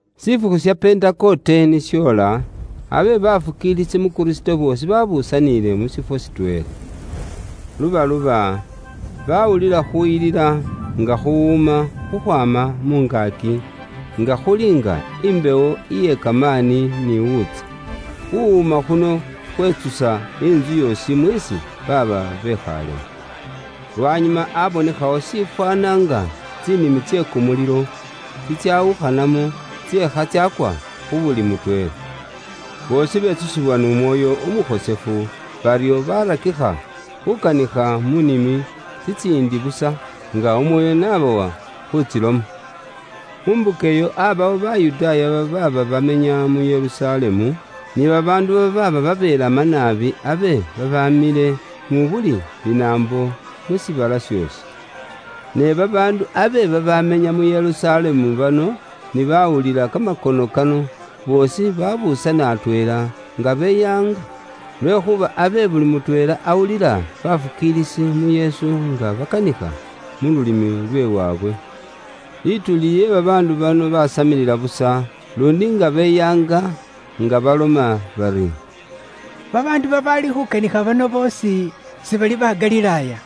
Shifukhu sha Pentekote ni shoola, abe bafukiilisi mu Kristo boosi baabuusaniile mu shifwo shitweela. Lubaluba, baawulila khuuyilila nga khuwuuma khukhwaama mu ngaaki, nga khuli nga imbewo iye kamaani ni wuutsa. Khuwuuma khuno khwetsusa intsu yoosi mweesi baaba bekhaalemwo. Lwanyuma abonekhawo shishafwaana nga tsinimi tse kumulilo tsitsawukhanamwo tseekha tsaakwa khu buli mutweela. Boosi betsusibwa n'Umwoyo Umukhosefu, baryo baarakikha khuukanikha mu nimi tsitsiindi busa, nga Umwoyo n'abawa khuutsiloma. Mu mbuka iyo aabawo Bayudaaya babaaba bamenya mu Yerusalemu, ni babaandu babaaba babelama naabi abe babaamile mu buli linaambo lyoosi, liliili aasi we likulu. Ne babaandu abe babamenya mu Yerusalemu bano ni baawulila kamakono kano, boosi babuusana atweela, nga beyaanga, lwekhuuba abe buli mutweela awulila bafukiilisi mu Yesu nga bakanikha mu lulimi lwe waabwe. Lituuli lye babaandu bano baasamilila busa, luundi nga beyaanga nga baloma bari, “Babaandu babaali khuukanikha bano boosi sibali ba Galilaaya?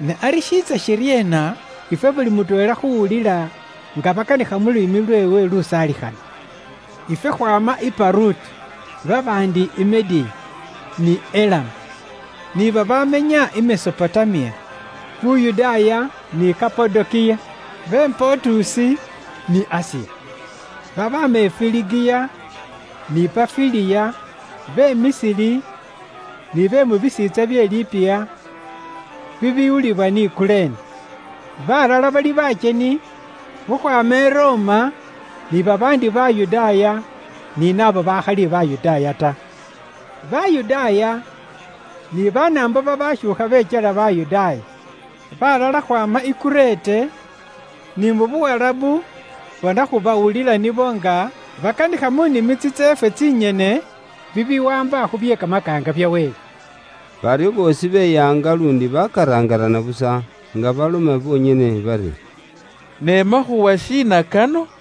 Ne ari shiitsa shiryeena ifwe buli mutweela khuuwulila nga bakanikha mu lulimi lweewe lusaalikhana? Ifwe khwaama i Paruti, babaandi i Mediya ni Elamu, ni babamenya i Mesopotamiya, Yuda ni Kapadokiya, be Pontusi ni Asiya. Babaama i Firigiya, ni Panfiliya, be Misiri, ni be mu bisiintsa bye Libiya bibiwulibwa ni Kurene. Balala bali bakyeni khukhwaama i Roma, ni babaandi Bayudaaya ni naabo bakhali Bayudaaya ta. Bayudaaya ni Banaambo babashuukha bekyela Bayudaaya. Baalala khwaama i Kurete ni mu Buwarabu, bona khubawulila nibo nga bakanikha mu nimi tsitseefwe tsinyene bibiwaamba khu bye kamakaanga bya Wele.” Baryo boosi beyaanga luundi bakaraangarana busa, nga baloma bonyene bari, “Ne makhuuwa shiina kano?”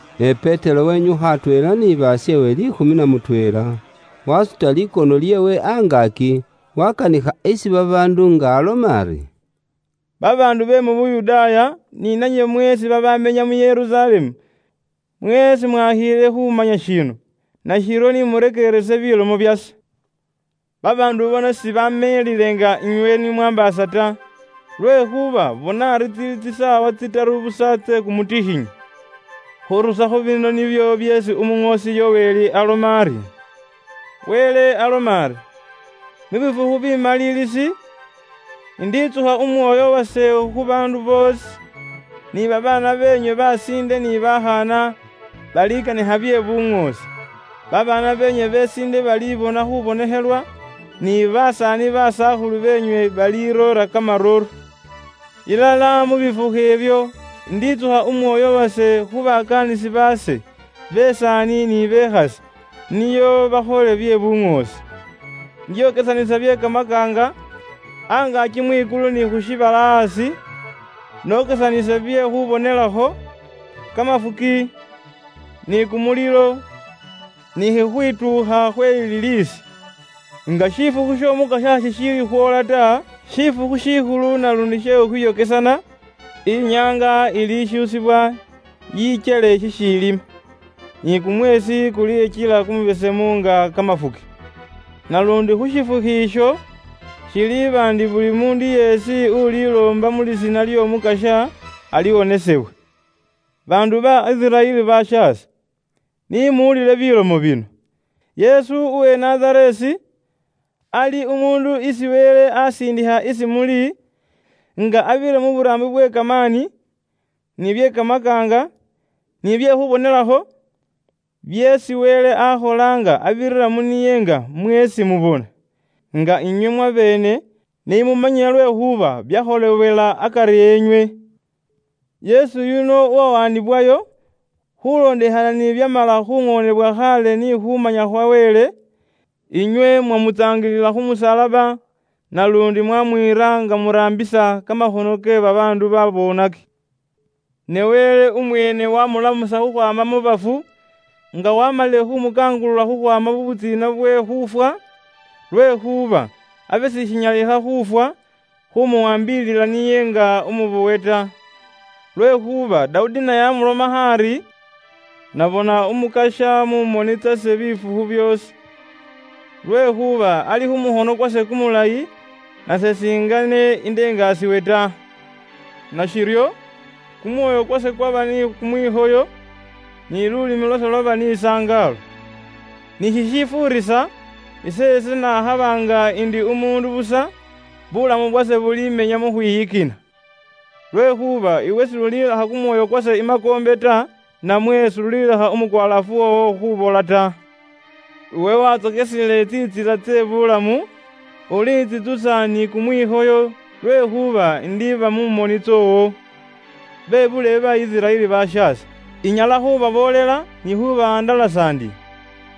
Ne Petero wenyukha atweela ni basheewe liikhumi na mutweela, wasuta likono lyeewe angaaki, wakanikha isi babaandu nga aloma ari, “Babaandu be mu Yuda ni nanywe mweesi babamenya mu Yerusalemu, mweesi mwakhiile khumanya shino, nashiryo ni murekeerese bilomo byase. Babaandu bano sibameelile nga inywe ni mwaambaasa ta, lwekhuuba bona ari tsili tsisaawa tsitaru busa tse kumutikhinyi. Khurusakho bino nibyo byeesi Umuŋoosi Yoweli aloma ari, ‘Wele aloma ari, mu bifukhu bimaliilisi, inditsukha Umwoyo wase khu baandu boosi, ni babaana beenywe besiinde ni bakhaana balikanikha bye buŋoosi. Babaana beenywe besiinde balibona khubonekhelwa, ni basaani basakhulu beenywe baliroora kamarooro. Ilala mu bifukhu ibyo inditsukha Umwoyo wase khu bakaanisi baase besaani ni bekhasi, nio bakhole bye buŋoosi. Indyokesanisa bye kamakaanga angaaki mwikulu ni khu shiibala aasi nokesanise bye khubonelakho, kamafuki, ni kumulilo, ni khukhwituukha khwe liliisi. Nga shifukhu sh'Omukasya shishiili khwoola ta, shifukhu shikhulu naluundi she khukhwiyokesana, inyaanga ilishuusibwa yikyele shishiilima, ni kumweesi kulikyela kumubesemu nga kamafuki. Naluundi khu shifukhu isho, shiliiba ndi buli muundu yeesi uliloomba mu lisiina ly'Omukasya, aliwonesebwa.’ “Baandu ba Isiraeli bashaase, ni muwulile bilomo bino: Yesu uwe Nazareesi, ali umuundu isi Wele asiindikha isi muli, nga abirira mu buraambi bwe kamaani, ni bye kamakaanga, ni bye khubonelakho, byeesi Wele akhola nga abirira mu niye nga mweesi mubona. Nga inywe mwabeene ni mumanyile lwekhuuba byakholebwela akari enywe. Yesu yuno uwawaanibwayo khulondekhana ni bibyamala khuŋoonebwa khaale ni khumanya khwa Wele, inywe mwamutsaangilila khu musalaba naluundi mwamwiira nga muraambisa kamakhono ke babaandu babonaki. Ne Wele umweene wamulamusa khukhwaama mu bafu, nga waamalile khumukangulula khukhwaama mu butsiina bwe khuufwa, lwekhuuba abe sishinyalikha khuufwa khumuwaambilila niye nga umubowe ta. Lwekhuuba Dawudi naye amulomakho ari, ‘Nabona Umukasya mu moni tsase bifukhu byoosi. Lwekhuuba ali khu mukhono kwase kumulayi, nase singene indengasiwe ta. Nashiryo, kumwoyo kwase kwaba ni kumwikhoyo, ni lulimi lwase lwaba ni sangaalo. Ni shishifuurisa, iseese nakhaba nga ndi umuundu busa, bulamu bwase bulimenya mu khwiyikina. Lwekhuuba iwe s'ulilekha kumwoyo kwase i makoombe ta, namwe s'ulilekha umukwalaafu woowo khubola ta. Iwe wantsokesile tsintsila tsye buulamu, ulintsitsusa ni kumwikhoyo lwekhuuba indiiba mu moni tsoowo.’ “Bebuulebe ba Isiraeli bashaase, inyala khubaboolela ni khubawandalasa ndi,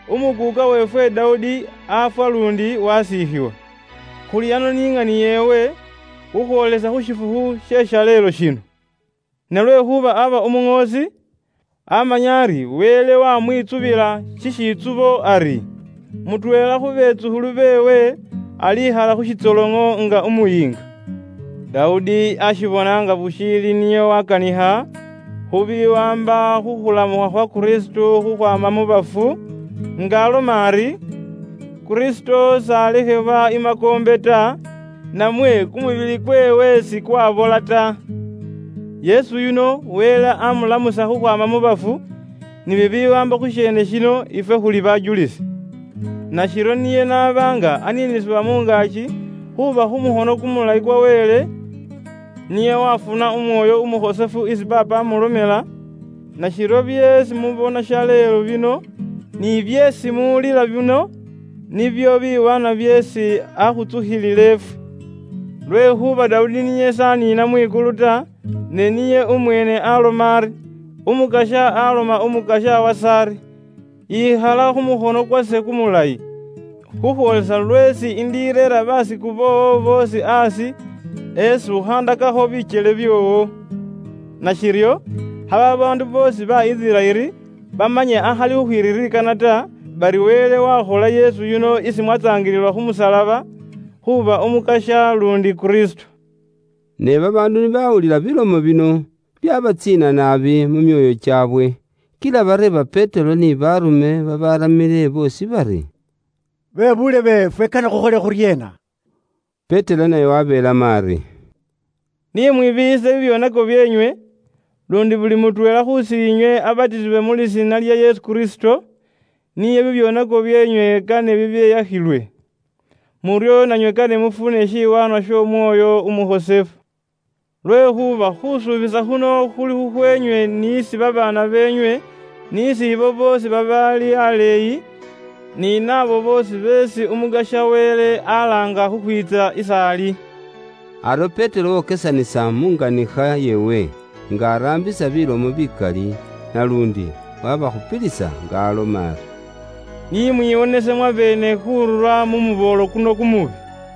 umukuuka weefwe Dawudi afwa luundi wasiikhiwa, khuli ano ni ŋani yeewe khukhwoolesa khu shifukhu she shaleelo shino. Sam 7.12,13Ne lwekhuuba aba umuŋoosi, amanya ari Wele wamwitsubila shishitsubo ari, mutweela khu betsukhulu beewe alikhala khu shitsoloŋo nga umuyiinga. Dawudi ashibona nga bushiili nio wakanikha khu biwaamba khu khulamukha khwa Kristo khukhwaama mu bafu, nga aloma ari, Kristo s'alekhebwa i makoombe ta, namwe kumubili kweewe sikwabola ta. Yesu yuno Wele amulamusa khukhwaama mu bafu, ni bibiwaamba khu sheene shino, ifwe khuli bajulisi. Nashiryo niye n'aba nga aniinisibwa mu ngaaki khuuba khu mukhono kumulayi kwa Wele, niye wafuna Umwoyo Umukhosefu isi Paapa amulomela, nashiryo byeesi mubona shaleelo bino ni byeesi muwulila bino nibyo biwaanwa byeesi akhutsukhiliile ifwe. Lwekhuuba Dawudi niye s'aniina mwikulu ta, ne niye umweene aloma ari, ‘Umukasya aloma Umukasya wase ari, yikhala khu mukhono kwase kumulayi, khukhwoolesa lweesi indireera baasiku boowo boosi aasi esi ukhaandakakho bikyele byoowo.’ “Nashiryo kha babaandu boosi ba Isiraeli bamanye akhali khukhwiririkana ta, bari Wele wakhola Yesu yuno isi mwatsaangilila khu musalaba, khuuba Umukasya luundi Kristo.” Ne babaandu ni bawulila bilomo bino, byabatsiina naabi mu myoyo kyaabwe, kila bareeba Petero ni baarume babaramile boosi bari, “Bebuulebe ifwe kane khukhole khuryeena?” Petero naye wabeelamo ari, “Ni mwibiiyise bibyoonako byeenywe, luundi buli mutweela khusiinywe abatisibwe mu lisiina lya Yesu Kristo, nio bibyoonako byeenywe kane bibeyakhilwe. Muryo nanywe kane mufune shiwaanwa sh'Omwoyo Umukhosefu. Lwekhuuba khusuubisa khuno khuli khukhweenywe n'isi babaana beenywe, n'isi ibo boosi babaali aleeyi, ni naabo boosi beesi Umukasya Wele alaanga khukhwiitsa is'ali.” Aryo Petero wokesanisa munganikha yeewe nga araambisa bilomo bikali naluundi wabakhupilisa nga aloma ari, “Ni mwiwonese mwabeene khurura mu muboolo kuno kumubi.”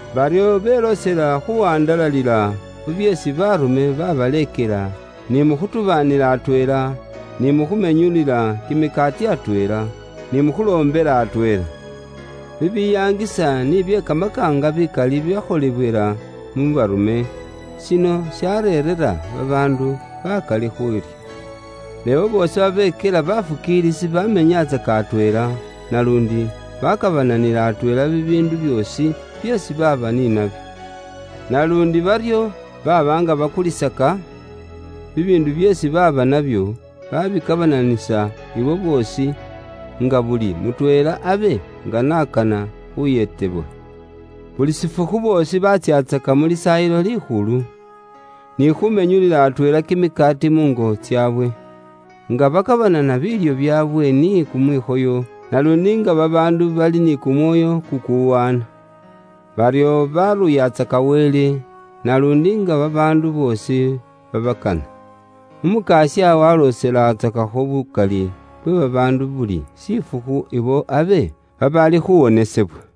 Baryo beloosela khuwandalalila khu byeesi baarume babaleekela ni mu khutubaanila atweela, ni mukhumenyulila kimikaati atweela, ni mu khuloombela atweela. Bibiyaangisa ni bye kamakaanga bikali byakholebwela mu baarume, shino shareerera babaandu bakali khuurya. Ne ibo boosi babekyela bafukiilisi bamenyatsaka atweela, naluundi bakabananila atweela bibiindu byoosi byeesi baaba ni nabyo. Naluundi baryo baba nga bakulisaka bibiindu byeesi baaba nabyo, babikabananisa isi boosi, nga buli mutweela abe nga n'akana khuyeetebwa. Buli shifukhu boosi batsyatsaka mu Lisaayilo Likhulu, ni khumenyulila atweela kimikaati muungo tsaabwe, nga bakabanana biilyo byaabwe ni kumwikhoyo naluundi nga babaandu bali ni kumwoyo kukuwaana. Baryo baruuyatsaka Wele, naluundi nga babaandu boosi babakana. Umukasya walooselatsakakho bukali bwe babaandu buli shifukhu ibo abe babaali khuwonesebwa.